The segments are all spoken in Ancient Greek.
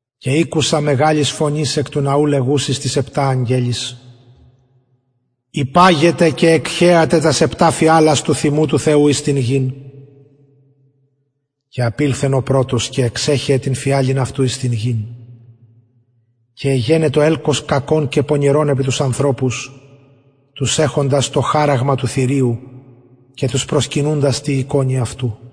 και ηκουσα φωνης μεγαλης εκ του ναου λεγουσης τοις επτα αγγελοις υπαγετε και εκχεατε τας επτα φιαλας του θυμου του θεου εις την γην και απηλθεν ο πρωτος και εξεχεεν την φιαλην αυτου εις την γην και εγενετο ελκος κακον και πονηρον επι τους ανθρωπους τους εχοντας το χαραγμα του θηριου και τους προσκυνουντας τη εικονι αυτου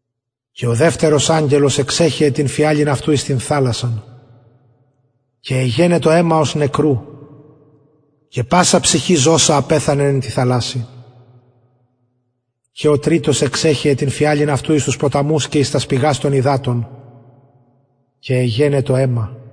και ο δευτερος αγγελος εξεχεεν την φιαλην αυτου εις την θαλασσαν και εγενετο αιμα ως νεκρου και πασα ψυχη ζωσα απεθανεν εν τη θαλασση και ο τριτος εξεχεεν την φιαλην αυτου εις τους ποταμους και εις τας πηγας των υδατων και εγενετο αιμα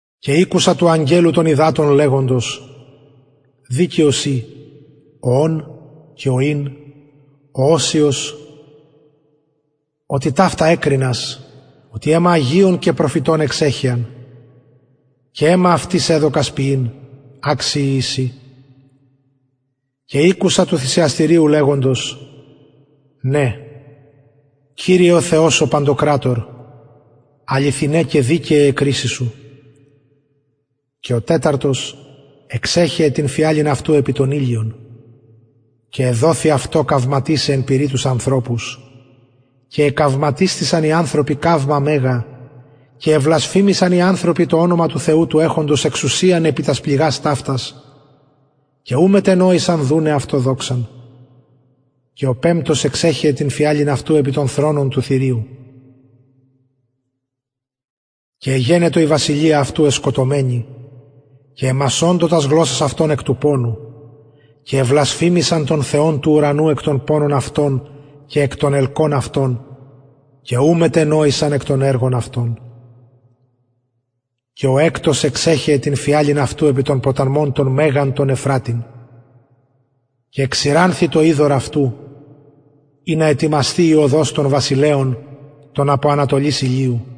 και ηκουσα του αγγελου των υδατων λεγοντος δικαιος ει ο ων και ο ην ο οσιος οτι ταυτα εκρινας οτι αιμα αγιων και προφητων εξεχεαν και αιμα αυτοις εδωκας πιειν αξιοι εισιν και ηκουσα του θυσιαστηριου λεγοντος ναι κυριε ο θεος ο παντοκρατωρ αληθιναι και δικαιαι αι κρισεις σου και ο τεταρτος αγγελος εξεχεεν την φιαλην αυτου επι τον ηλιον και εδοθη αυτω καυματισαι εν πυρι τους ανθρωπους και εκαυματισθησαν οι ανθρωποι καυμα μεγα και εβλασφημησαν οι ανθρωποι το ονομα του θεου του εχοντος εξουσιαν επι τας πληγας ταυτας και ου μετενοησαν δουναι αυτω δοξαν και ο πεμπτος εξεχεεν την φιαλην αυτου επι τον θρονον του θηριου και εγενετο η βασιλεια αυτου εσκοτωμενη και εμασωντο τας γλωσσας αυτων εκ του πονου και εβλασφημησαν τον θεον του ουρανου εκ των πονων αυτων και εκ των ελκων αυτων και ου μετενοησαν εκ των εργων αυτων και ο εκτος εξεχεεν την φιαλην αυτου επι τον ποταμον τον μεγαν ευφρατην και εξηρανθη το υδωρ αυτου ινα ετοιμασθη η οδος των βασιλεων των απο ανατολης ηλιου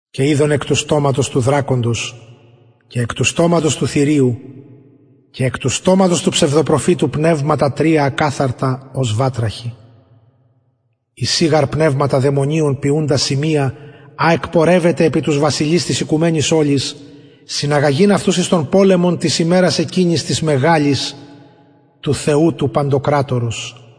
και ειδον εκ του στοματος του δρακοντος και εκ του στοματος του θηριου και εκ του στοματος του ψευδοπροφητου πνευματα ακαθαρτα τρια ως βατραχοι εισιν γαρ πνευματα δαιμονιων ποιουντα σημεια α εκπορευεται επι τους βασιλεις της οικουμενης ολης συναγαγειν αυτους εις τον πολεμον της ημερας εκεινης της μεγαλης του θεου του παντοκρατορος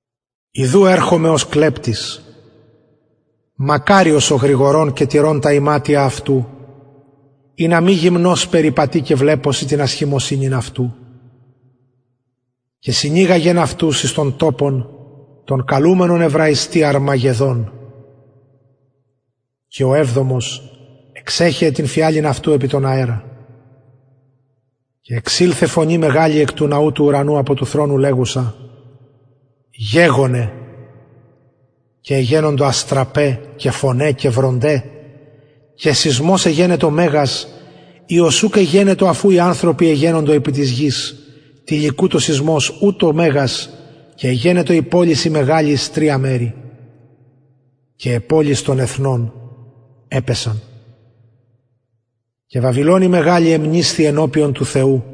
ιδου ερχομαι ως κλεπτης μακαριος ο γρηγορων και τηρων τα ιματια αυτου ινα μη γυμνος περιπατη και βλεπωσιν την ασχημοσυνην αυτου και συνηγαγεν αυτους εις τον τοπον τον καλουμενον εβραιστι αρμαγεδων και ο εβδομος εξεχεεν την φιαλην αυτου επι τον αερα και εξηλθεν φωνη μεγαλη απο του ναου του ουρανου απο του θρονου λεγουσα γεγονεν και εγενοντο αστραπαι και βρονται και φωναι και σεισμος μεγας οιος ουκ εγενετο αφ ου οι ανθρωποι εγενοντο επι της γης τηλικουτος σεισμος ουτως μεγας και εγενετο η πολις η μεγαλη εις τρια μερη και αι πολεις των εθνων επεσον και βαβυλων η μεγαλη εμνησθη ενωπιον του θεου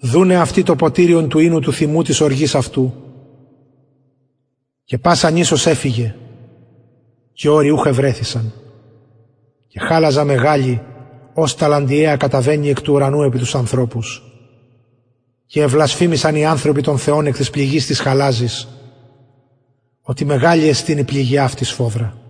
δουναι αυτη το ποτηριον του οινου του θυμου της οργης αυτου και πασα νησος εφυγεν και ορη ουχ ευρεθησαν και χαλαζα μεγαλη ως ταλαντιαια καταβαινει εκ του ουρανου επι τους ανθρωπους και εβλασφημησαν οι ανθρωποι τον θεον εκ της πληγης της χαλαζης οτι μεγαλη εστιν η πληγη αυτης σφοδρα